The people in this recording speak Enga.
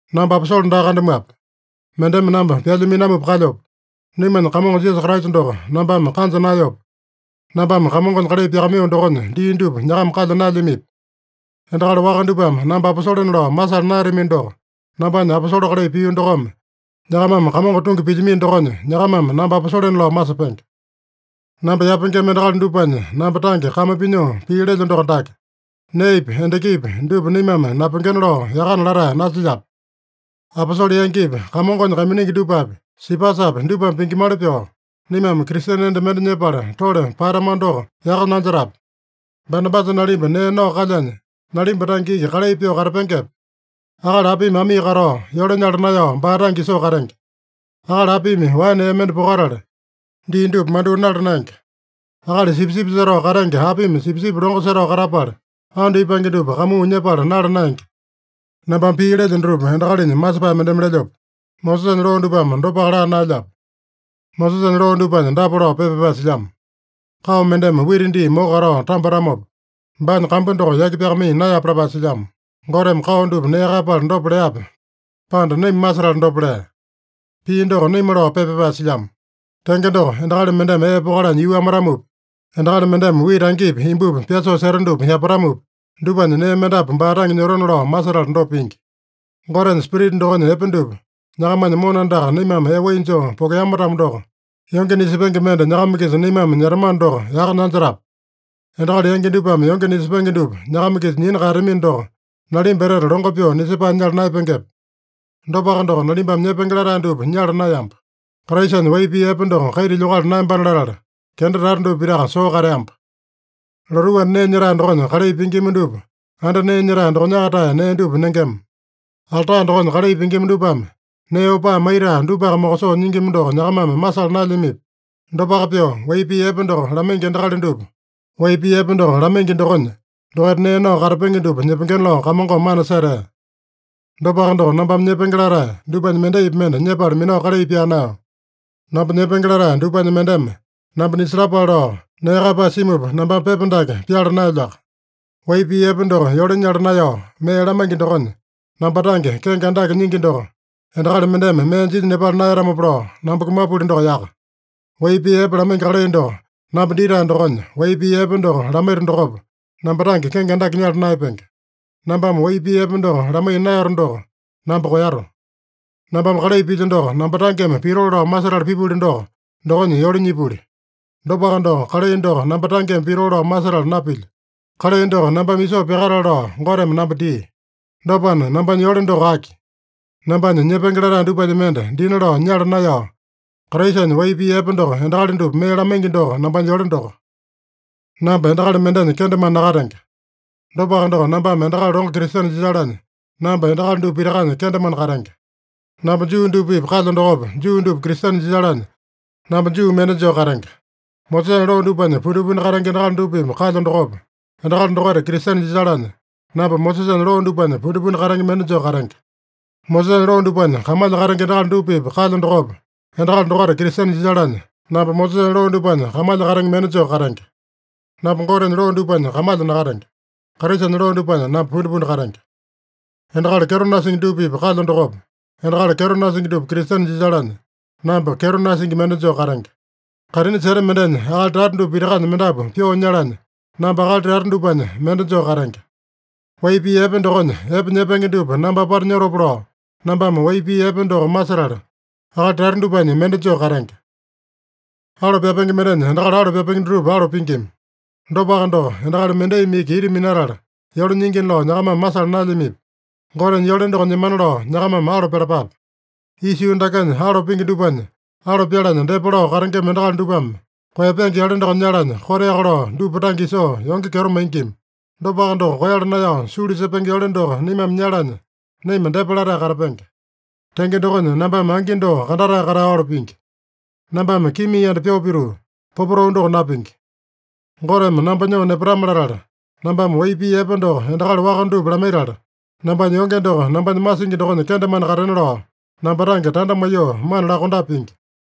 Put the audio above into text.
Namba aposole daa kandamuape? Mendeme namba pyalya minamupa kalyope? Naimanya Kamongo Jisasa Kraisa doko nambame kanja naeyope? Nambame Kamongonya kalai pyakamaiyo dokonya dii dupa nyakama kalya naelyamipi? Endakali waka dupame namba aposolena lao masala naeyatamino doko, nambanya aposole kalai pio dokome, nyakamame Kamongo tungi pilyamino dokonya, nyakamame namba aposolena lao masepenge. Namba yapengema endakali dupanya namba tange kame pinyoo pii lelyo doko dake: Neepi, endakipi dupa naimame napengena lao yakana latae nasilyape? Aposole yangipi, Kamongonya kaiminingi dupapi, Sipasapi dupame pingimali pyoo, naimame Kristene enda mende nyepala tole paeyatamano doko yaka nanjetape? Banabasa nalimba nee nao kalyanya, nalimba tange iki kalai pyoo katapengepe? Akali apimi amii katao, yole nyala naeyao baa tange isoo katenge? Akali apimi waene ee mende pokatala, dii dupa mandyoo nala naenge? Akali sipisipi setao katenge apimi sipisipi longo setao katapala, andu ipange dupa kamuu nyepala nala naenge? Nambame pii lelyo dutupa, endakalinya masepae mendeme lelyope? Mosesanya loo dupame dopaka laa naelyape? Mosesanya loo dupanya dapa lao pepa pyapae silyamo: “Kao mendeme wita dii moko katao tambatamopa, baanya kambu doko yaki pyakamaiya naeyape” lapae silyamo. Goteme kao dupa nee kaeyapala dopa leape, pande naima masetala dopa lea? Pii doko naima lao pepa pyapae silyamo. Tenge doko, endakali mendeme ee pokalanya yuu amatamopi, endakali mendeme wita angipi imbupi pyasoo seta dupa yapatamopi, dupanya nee mendapu baa tange nyotona lao masetala dopa pingi. Gotenya Spirita dokonya epe dupa nyakamanya mona andaka naimame ee wai joo pokokeama-tamo doko, yonge nisepenge mende nyakama-kisa naimame nyetamano doko yaka nanjetape? Endakali yangi dupame yonge nisepenge dupa nyakama-kisa nyina kaeyatamino doko, nalimba etete longo pyoo nisepae nyala naeyapengepe? Dopaka doko, nalimbame nyepenge latae dupa nyala naeyamba. Kraisanya wai pii epe doko kaita lyokala naeyambana latala, kenda tata dupa pitaka soo kateamba. Lotuu anda nee nyetae dokonya kalai pingima dupa anda nee nyetae dokonyaka-tae nee dupa nengema. Alta dokonya kalai pingima dupame nee opaa maitae dupaka mokosoo nyingima doko nyakamame masala naelyamipi? Dopaka pyoo, wai pii epe doko lamaingi endakali dupa wai pii epe doko lamaingi dokonya, dokaita nee nao katapenge dupa nyepengena lao Kamongome mana setea. Dopaka doko, nambame nyepenge latae dupanya mendaipi mende nyepala minao kalai pyaa naeyo. Namba nyepenge latae dupanya mendeme namba nisalapale lao nee kaeyapae simupa nambame pepa dake pyala naelyoaka. Wai pii epe doko yole nyala naeyao mee lamaingi dokonya, namba tange kenge andake nyingi doko endakali mendeme mee jinya nepala naeyatamopa lao, namba kumapuli doko yaka. Wai pii epe lamaingi kalai doko namba ditae dokonya, wai pii epe doko lamaito dokopa, namba tange kenge andake nyala naeyapenge. Nambame wai pii epe doko lamaiya naeyato doko, namba koeyato. Nambame kalai pilyo doko, namba tangeme pitoo lao masetala pipuli doko, dokonya yole nyipuli. Dopaka doko, kalai doko namba tangeme pitoo lao masetala napilyo. Kalai doko nambame isoo pyakatale lao Goteme namba dia. Dopana, nambanya yole doko aki? Nambanya nyepenge latae dupanya mende dina lao nyala naeyao, Kraisanya wai pii epe doko endakali dupa mee lamaingi doko, nambanya yole doko. Namba endakali mendenya kendemane nakatenge. Dopaka doko, nambame endakali longo Kristene jisalanya, namba endakali dupa pitakanya kendemane katenge. Namba Juu dupa-pipa kalyo dokopa, Juu dupa Kristene jisalanya, namba Juu mende joo katenge. Mosesanya loo dupanya pundipundi katenge endakali dupa-pipa kalyo dokopa, endakali dokaita Kristene jisalanya, namba Mosesanya loo dupanya pundipundi katenge mende joo katenge. Mosesanya loo dupanya kamalya katenge endakali dupa-pipa kalyo dokopa, endakali dokaita Kristene jisalanya, namba Mosesanya loo dupanya kamalya katenge mende joo katenge. (Namba Gotenya loo dupanya kamalya nakatenge. Kraisanya loo dupanya namba pundipundi katenge.) Endakali kyeto nasingi dupa-pipa kalyo dokopa, endakali kyeto nasingi dupa Kristene jisalanya, namba kyeto nasingi mende joo katenge. Kaitini seta mendenya akali tata dupa pitakanya mendapu pyoo nyalanya, namba akali tata dupanya mende joo katenge. Wai pii epe dokonya epe nyepenge dupa namba apata nyotopa lao, nambame wai pii epe doko masetala, akali tata dupanya mende joo katenge. Alo pyapenge mendenya endakali alo pyapenge dutupa alo pingima. Dopaka doko, endakali mendaimi iki ita minatala yole nyingina lao nyakamame masala naelyamipi? Gotenya yole doko nyemana lao nyakamame alo pyalapape. Isa yuu dakenya alo pingi dupanya alo pyalanya depa lao katengema endakali dupame koeyapenge yole doko nyalanya, koteaka lao dupa tange isoo yonge kyeto maingima. Dopaka doko, koeyala naeyao sulu sepenge yole doko naimame nyalanya, naima depa latae katapenge. Tenge dokonya, nambame angi doko kandatae katao alo pingi. Nambame kimia yanda pyoo pituu, popotau doko napingi. Goteme namba nyoo nepatame-latala, nambame wai pii epe doko endakali waka dupa lamaitala, nambanya yonge doko nambanya masingi dokonya kendemane katena lao, namba tange tanda maiyoo mana lakondape pingi.